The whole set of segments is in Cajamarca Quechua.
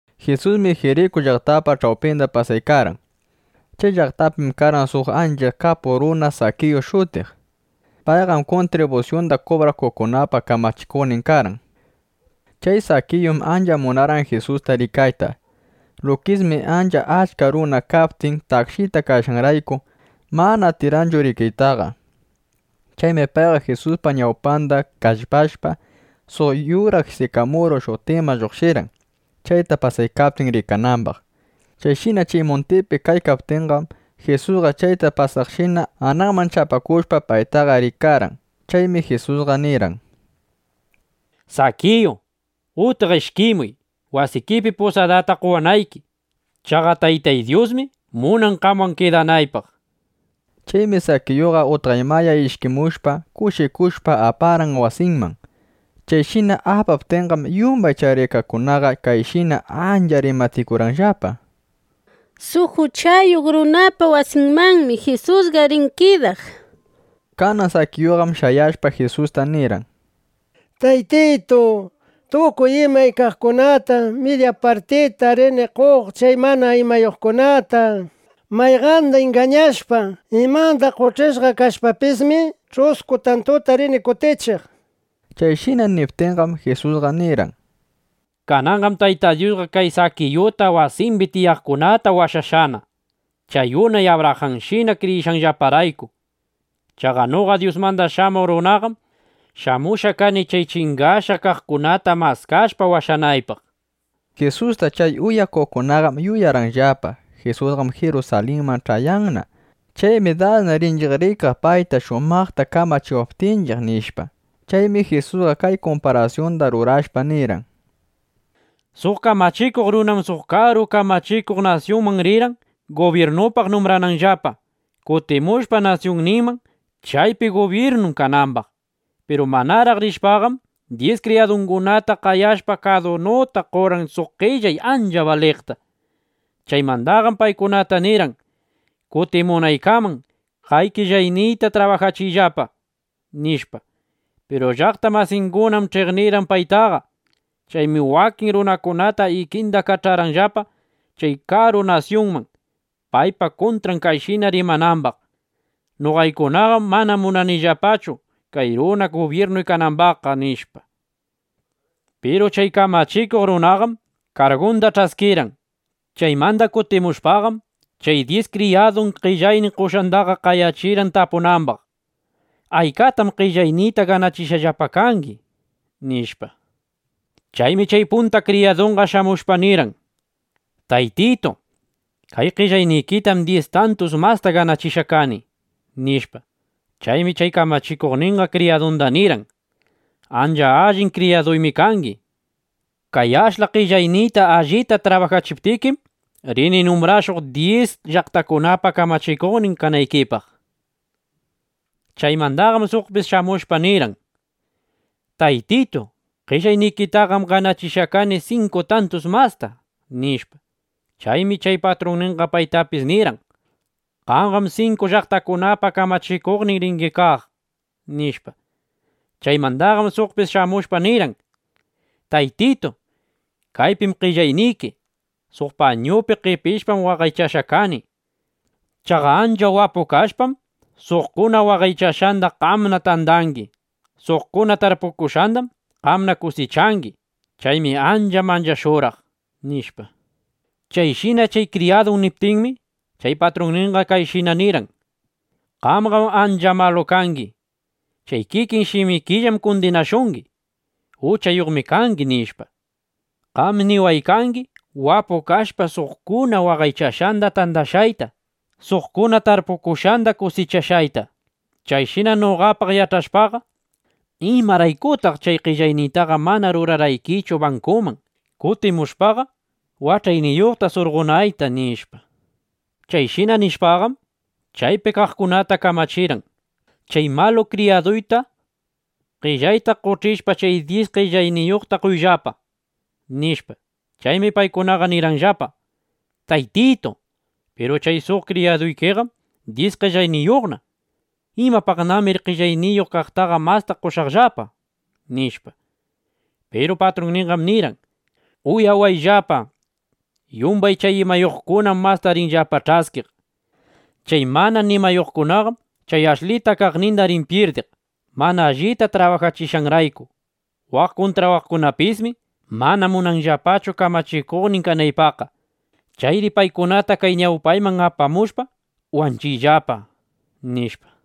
Jisusmi Jiriku llaqtapa ch'awpinda pasaykarqan. Chay llaqtapim karqan suq ancha kapuq runa Sakiyu shutiq. Payqam kuntribusyunda kubrakuqkunapa kamachikuqnin karqan. Chay Sakiyum ancha munarqan Jisusta rikayta. Lukismi ancha achka runa kaptin, takshita kashqanrayku, mana atirqanchu rikaytaqa. Chaymi payqa Jisuspa ñawpanda kallpashpa, suq yura sikamuru shutiqman lluqshirqan, chayta pasaykaptin, rikanambaq. Chayshina chay muntipi kaykaptinqam, Jisusqa chayta pasaqshina anaqman chapakushpa, paytaqa rikarqan. Chaymi Jisusqa nirqan: —Sakiyu, utqa ishkimuy, wasikipi pusadata qowanayki. Chaqa Taytay Dyusmi munan, qamwan kidanaypaq, nishpa. Chaymi Sakiyuqa utqaymaya ishkimushpa, kushikushpa aparqan wasinman. Chayshina apaptinqam, yumbay chay rikaqkunaqa kayshina ancha rimatikurqanllapa: —Suq uchayuq runapa wasinmanmi Jisusqa rin kidaq, nishpa. Kanan Sakiyuqam shayashpa, Jisusta nirqan: —Taytitu, tukuy imay kaqkunatam midya partita rini qoq chay mana nimayuqkunata. Mayqanda ingañashpa, imanda qoch'ishqa kashpapismi, ch'usku tantuta rini kutichiq, nishpa. Chayshina niptinqam, Jisusqa nirqan: —Kananqam Tayta Dyusqa kay Sakiyuta wasimbi tiyaqkunata washashqana, chay unay Abrajanshina kriyishqanllaparayku. Chaqa noqa Dyusmanda Shamuq Runaqam shamushqa kani chay chingashqa kaqkunata maskashpa, washanaypaq, nishpa. Jisusta chay uyaykaqkunaqam yuyarqanllapa: Jisusqam Jirusalinman ch'ayaykanna. Chaymi dasna rinchiq rikaq paytaqa, shumaqta kamachiwaptinchiq, nishpa. Chaymi Jisusqa kay kumparasyunda rurashpa nirqan: —Suq kamachikuq runam suq karu kamachikuq nasyunman rirqan gubyirnupaq numbrananllapa, kutimushpa nasyunninman, chaypi gubyirnun kanambaq. Piru manaraq rishpaqam, dyis kriyadungunata qayashpa, kadunuta qorqan suq qellay ancha baliqta. Chaymandaqam paykunata nirqan: “Kutimunaykaman kay qellayniyta trabajachiyllapa”, nishpa. Piru llaqta masingunam ch'iqnirqan paytaqa. Chaymi wakin runakunata ikinda kach'arqanllapa chay karu nasyunman, paypa kuntran kayshina rimanambaq: “Noqaykunaqam mana munanillapachu chay runa gubyirnuy kanambaqqa”, nishpa. ’Piru chay kamachikuq runaqam kargunda ch'askirqan. Chaymanda kutimushpaqam, chay dyis kriyadun qellaynin qoshqandaqa qayachirqan tapunambaq: “¿Aykatam qellayniyta ganachishqallapa kangi?” nishpa. Chaymi chay punta kriyadunqa shamushpa nirqan: “Taytitu, kay qellaynikitaqam dyis tantus masta ganachishqa kani”, nishpa. Chaymi chay kamachikuqninqa kriyadunda nirqan: “Ancha allin kriyaduymi kangi. Kay ashla qellayniyta allita trabajachiptikim, rini numbrashuq, dyis llaqtakunapa kamachikuqnin kanaykipaq”, nishpa. Chaymandaqam suqpis shamushpa nirqan: “Taytitu, qellaynikitaqam ganachishqa kani sinku tantus masta”, nishpa. Chaymi chay patrunninqa paytapis nirqan: “Qamqam sinku llaqtakunapa kamachikuqnin ringi kaq”, nishpa. ’Chaymandaqam suqpis shamushpa nirqan: “Taytitu, kaypim qellayniki. Suq pañuypi qepishpam waqaychashqa kani. Chaqa ancha wapu kashpam, suqkuna waqaychashqanda qamna tandangi. Suqkuna tarpukushqandam qamna kusichangi. Chaymi ancha manchashurqaq”, nishpa. Chayshina chay kriyadun niptinmi, chay patrunninqa kayshina nirqan: “Qamqam ancha malu kangi. Chay kikin shimikillam kundinashungi: ‘Uchayuqmi kangi’ nishpa. Qami niwaykangi wapu kashpa, suqkuna waqaychashqanda tandashqayta, suqkuna tarpukushqanda kusichashqayta. Chayshina noqapaq yach'ashpaqa, ¿imaraykutaq chay qellayniytaqa mana rurarqaykichu bankuman, kutimushpaqa wach'ayniyuqta surqonayta?” nishpa. ’Chayshina nishpaqam, chaypi kaqkunata kamachirqan: “Chay malu kriyaduyta qellayta qoch'ishpa, chay dyis qellayniyuqta qoyllapa”, nishpa. Chaymi paykunaqa nirqanllapa: “Taytitu, piru chay suq kriyaduykiqam dyis qellayniyuqna. ¿Imapaqnamiri qellayniyuq kaqtaqa masta qoshaqllapa?” nishpa. Piru patrunninqam nirqan: “Uyawayllapa, yumbay chay imayuqkunam masta rinllapa ch'askiq. Chay mana nimayuqqam chay ashlita kaqninda rin pyirdiq (mana allita trabajachishqanrayku). Waq kuntraykunapismi mana munanllapachu kamachikuqnin kanaypaqqa. Chayri paykunata kay ñawpayman apamushpa, wanchiyllapa”, nishpa.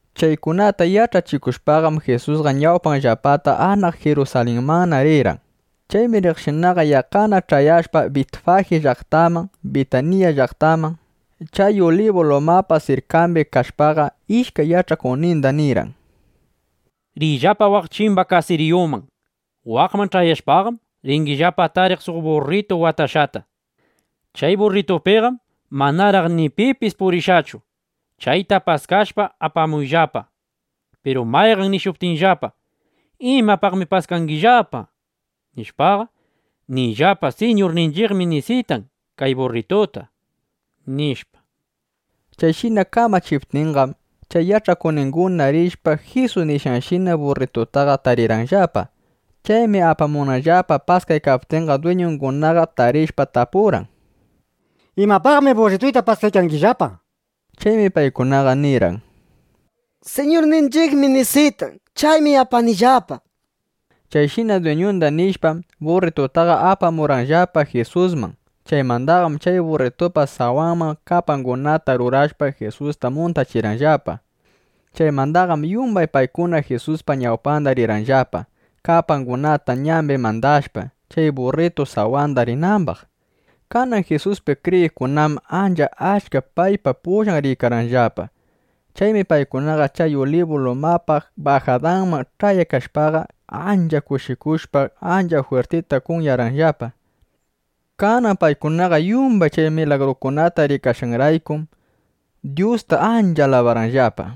Chaykunata yach'achikushpaqam, Jisusqa ñawpanllapata anaq Jirusalinmanna rirqan. Chaymi riqshinaqa, yaqqana ch'ayashpa Bitfaji llaqtaman, Bitanilla (Bitaniya) llaqtaman, chay Ulibu lumapa sirkambi kashpaqa, ishkay yach'akuqninda nirqan: —Riyllapa waq chimba kasiriyuman. Waqman ch'ayashpaqam, ringillapa tariq suq burritu watashqata. Chay burritupiqam manaraq ni pipis purishqachu. Chayta paskashpa, apamuyllapa. Piru mayqan nishuptinllapa: “¿Imapaqmi paskangillapa?” nishpaqa, niyllapa: “Siñurninchiqmi nisitan kay burrituta”, nishpa. Chayshina kamachiptinqam, chay yach'akuqninguna rishpa, Jisus nishqanshina burritutaqa tarirqanllapa. Chaymi apamunanllapa paskaykaptinqa, dwiñungunaqa tarishpa tapurqan: —¿Imapaqmi burrituyta paskaykangillapa? nishpa. Chaymi paykunaqa nirqan: —Siñurninchiqmi nisitan. Chaymi apanillapa, nishpa. Chayshina dwiñunda nishpam, burritutaqa apamurqanllapa Jisusman. Chaymandaqam chay burritupa sawanman kapangunata rurashpa, Jisusta muntachirqanllapa. Chaymandaqam yumbay paykunaqa Jisuspa ñawpanda rirqanllapa, kapangunata ñambi mandashpa, chay burritu sawanda rinambaq. Kanan Jisuspi kriyiqkunam ancha achka paypa pullan riykarqanllapa. Chaymi paykunaqa chay Ulibu lumapa bajadanman ch'ayaykashpaqa, ancha kushikushpa, ancha jwirtita kunyarqanllapa. Kanan paykunaqa yumbay chay milagrukunata rikashqanraykum, Dyusta ancha alabarqanllapa: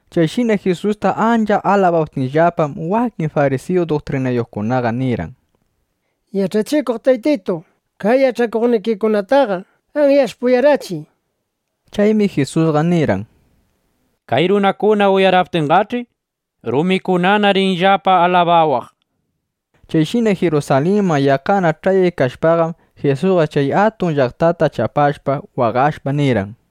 Chayshina Jisusta ancha alabaptinllapam, wakin farisiyu duktrinayuqkunaqa nirqan: —Yach'achikuq Taytitu, kay yach'akuqnikikunataqa anyashpa uyarachiy, nishpa. Chaymi Jisusqa nirqan: —Kay runakuna uyaraptinqach'i, rumikunana rinllapa alabawaq, nishpa. Chayshina Jirusalinman yaqqana ch'ayaykashpaqam, Jisusqa chay atun llaqtata chapashpa, waqashpa, nirqan: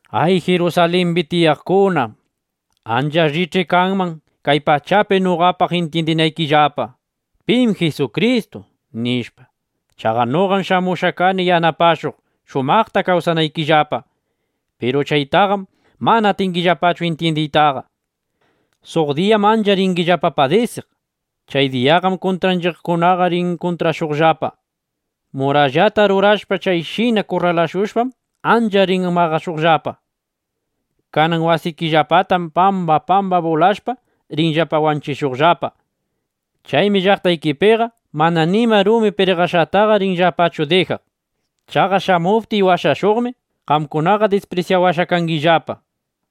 —¡Ay Jirusalimbi tiyaqkuna! Ancha allich'i kanman kay diyapi noqapaq intyindinaykillapa, ¿pim Jisukristu? nishpa. Chaqa noqam shamushqa kani yanapashuq, shumaqta kawsanaykillapa. Piru chaytaqam mana atingillapachu intyindiytaqa. Suq diyam ancha ringillapa padisiq. Chay diyaqam kuntraykikunaqa rin kurralashuqllapa, murallata rurashpa. Chayshina kurralashushpam, ancha rin maqashuqllapa. Kanan wasikillapatam pamba pamba bulashpa, rinllapa wanchishuqllapa. Chaymi llaqtaykipiqa mana nima rumi pirqashqataqa rinllapachu dijaq. Chaqa shamuptiy washashuqmi, qamkunaqa disprisyawashqa kangillapa.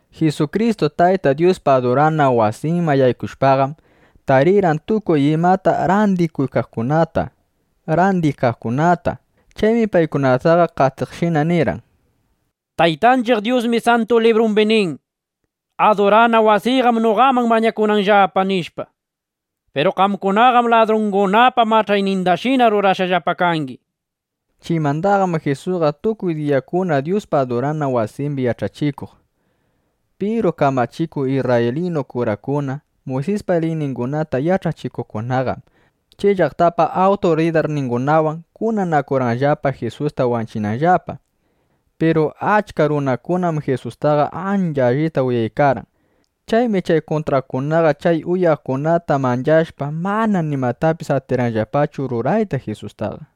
Jisukristu Tayta Dyuspa adurana wasinman yaykushpaqam, tarirqan tukuy imata randikuykaqkunata, randiykaqkunata. Chaymi paykunataqa qatiqshina nirqan: —Taytanchiq Dyusmi Santu Librumbi nin: “Adurana wasiyqam noqaman mañakunanllapa”, nishpa. Piru qamkunaqam ladrungunapa mach'aynindashina rurashqallapa kangi, nishpa. Chaymandaqam Jisusqa tukuy diyakuna Dyuspa adurana wasimbi yach'achikuq. Piru kamachikuq isrraylinu kurakuna, Muysispa liyningunata yach'achikuqkunaqam, chay llaqtapa awturidarningunawan kunanakurqanllapa, Jisusta wanchinanllapa. Piru achka runakunam Jisustaqa ancha allita uyaykarqan. Chaymi chay kuntraqkunaqa chay uyaqkunata manchashpa, mana nimatapis atirqanllapachu rurayta Jisustaqa.